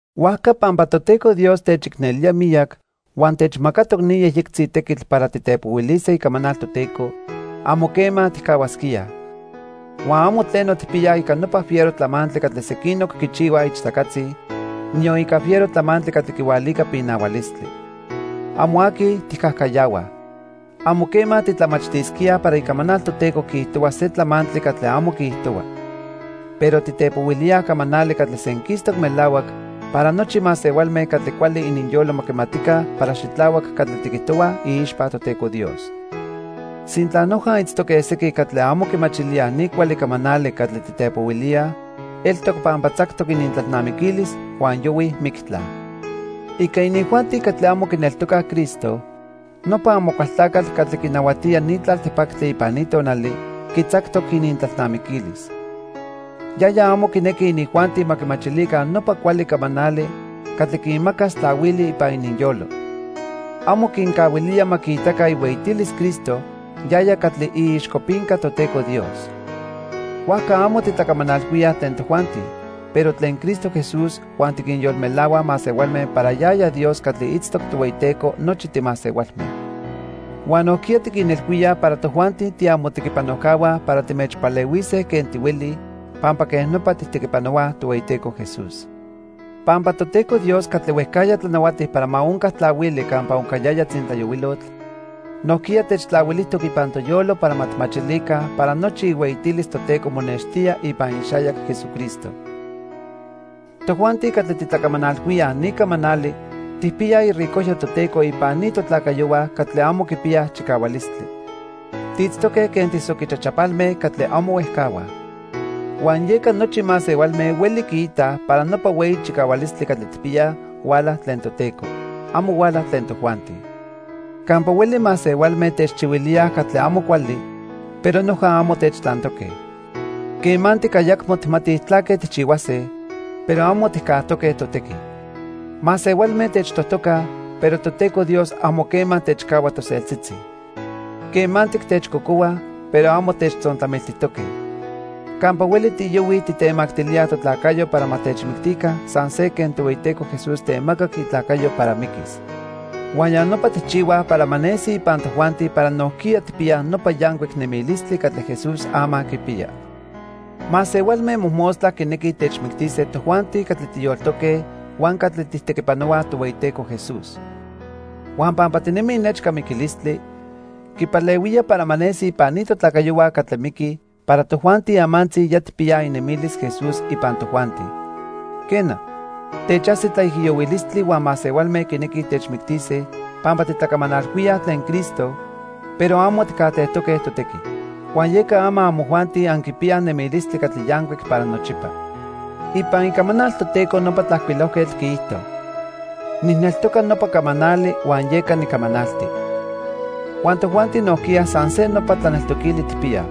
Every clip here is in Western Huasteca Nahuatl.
Huajca pampa Toteco Dios techicnelía miyac huan techmacatoc ni yejyectzi tequitl para titepohuilise icamanal Toteco, amo quema tijcahuasquíaj. Huan amo tleno tijpiyaj ica nopa fiero tlamantli catli sequinoc quichihuaj ichtacatzi, niyon ica fiero tlamantli catli quihualica pinahualistli. Amo aqui tijcajcayahuaj. Amo quema titlamachtisquíaj para Icamanal Toteco quiijtohua se tlamantli catli amo quiijtohua. Pero titepohuilíaj camanali catli senquistoc melahuac para nochi masehualme catli cuali ininyolo ma quimatica para xitlahuac catli tiquijtohuaj iixpa Toteco Dios. Sintla noja itztoque sequin catli amo quimachilíaj ni cuali camanali catli titepohuilíaj, eltoc pampa tzactoc inintlalnamiquilis huan yohuij mictla. Ica inijuanti catli amo quineltocaj Cristo, nopa Amocualtlacatl catli quinahuatía ni tlaltipactli ipan ni tonali, quitzactoc inintlalnamiquilis. Yaya amo quinequi inijuanti ma quimachilica nopa cuali camanali catli quinmacas tlahuili ipan ininyolo. Amo quincahuilía ma quiitaca ihueyitilis Cristo yaya catli iixcopinca Toteco Dios. Huajca amo titlacamanalhuíaj tlen tojuanti, pero tlen Cristo Jesús huan tiquinyolmelahuaj masehualme para yaya Dios catli itztoc Tohueyiteco nochi timasehualme. Huan nojquiya tiquinilhuíaj para tojuanti tiamotequipanojcahua para timechpalehuise quen tihuelij, pampa quej nopa tijtequipanohuaj Tohueyiteco Jesús. Pampa Toteco Dios catli huejcajya tlanahuati para ma onca tlahuili campa oncayaya tzintlayohuilotl, nojquiya techtlahuilijtoc ipan toyolo para ma tijmachilica para nochi ihueyitilis Toteco monextía ipan ixayac Jesucristo. Tojuanti catli titlacamanalhuíaj ni camanali tijpiyaj iricojyo Toteco ipan ni totlacayohua catli amo quipiyaj chicahualistli. Tiitztoque quen tisoquichachapalme catli amo huejcahuaj. Huan yeca nochi masehualme hueli quiitaj para nopa hueyi chicahualistli catli tijpiyaj, huala tlen Toteco. Amo huala tlen tojuanti. Campa hueli masehualme techchihuilíaj catli amo cuali, pero noja amo techtlantoque. Quemantic ayacmo tijmatij tlaque tijchihuase, pero amo tijcajtoque totequi. Masehualme techtojtocaj, pero Toteco Dios amo quema techcahua toseltzitzi. Quemantic techcocohuaj, pero amo techtzontlamiltijtoque. Campa hueli tiyohuij tijtemactilíaj totlacayo para ma techmictica san se quen Tohueyiteco Jesús temacac itlacayo para miquis. Huan ya nopa tijchihuaj para ma nesi ipan tojuanti para nojquiya tijpiyaj nopa yancuic nemilistli catli Jesús ama quipiya. Masehualme mojmostla quinequij techmictise tojuanti catli tiyoltoque huan catli tijtequipanohuaj Tohueyiteco Jesús. Huan pampa tinemij nechca miquilistli, quipalehuía para ma nesi ipan ni totlacayohua catli miquij para tojuanti amantzi ya tijpiyaj inemilis Jesús ipan tojuanti. Quena, techajsi tlaijiyohuilistli huan masehualme quinequij techmictise pampa titlacamanalhuíaj tlen Cristo, pero amo tijcajtejtoque totequi. Huan yeca ama amojuanti anquipiyaj nemilistli catli yancuic para nochipa. Ipan Icamanal Toteco nopa tlajcuilojquetl quiijto: "Nijneltoca nopa camanali huan yeca nicamanalti." Huan tojuanti nojquiya san se nopa tlaneltoquili tijpiyaj.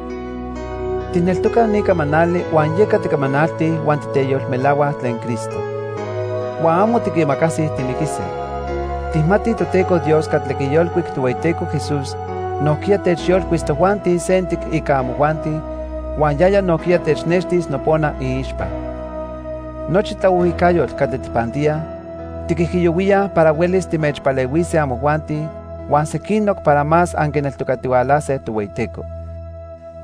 Tijneltocaj ni camanali huan yeca ticamanaltij huan titeyolmelahuaj tlen Cristo. Huan amo tiquimacasij timiquise. Tijmatij Toteco Dios catli quiyolcuic Tohueyiteco Jesús nojquiya techyolcuis tojuanti sentic ica amojuanti, huan yaya nojquiya technextis nopona iixpa. Nochi tlaohuijcayotl catli tijpantíaj, tiquijiyohuíaj para huelis timechpalehuise amojuanti huan sequinoc para más anquineltocatihualase Tohueyiteco.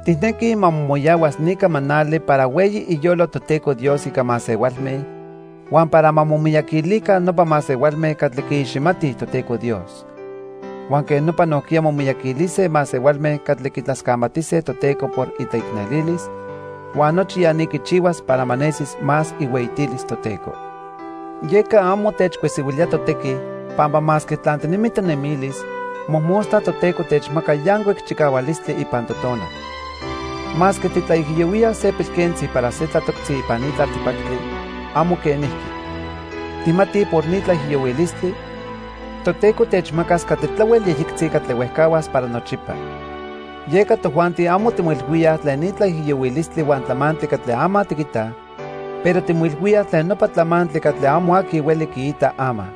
Tijnequij ma momoyahuas ni camanali para hueyi iyolo Toteco Dios ica masehualme huan para ma momiyaquilica nopa masehualme catli quiiximatij Toteco Dios. Huan quej nopa nojquiya momiyaquilise masehualme catli quitlascamatise Toteco por itlaicnelilis, huan nochi ya ni quichihuas para ma nesis más ihueyitilis Toteco. Yeca amo techcuesihuilía totequi, pampa masque tlantinemi tonemilis, mojmostla Toteco techmaca yancuic chicahualistli ipan totonal. Masque titlaijiyohuíaj se pilquentzi para se tlatoctzi ipan ni tlaltipactli, amo quenijqui. Tijmatij por ni tlaijiyohuilistli, Toteco techmacas catli tlahuel yejyectzi catli huejcahuas para nochipa. Yeca tojuanti amo timoilhuíaj tlen ni tlaijiyohuilistli huan tlamantli catli ama tiquitaj, pero timoilhuíaj tlen nopa tlamantli catli amo aqui hueli quiita ama.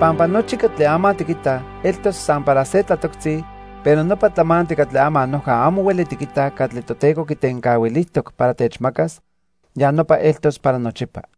Pampa nochi catli ama tiquitaj eltos san para se tlatoctzi, pero nopa tlamantli catli ama noja amo hueli tiquitaj catli Toteco quitencahuilijtoc para techmacas, ya nopa eltos para nochipa.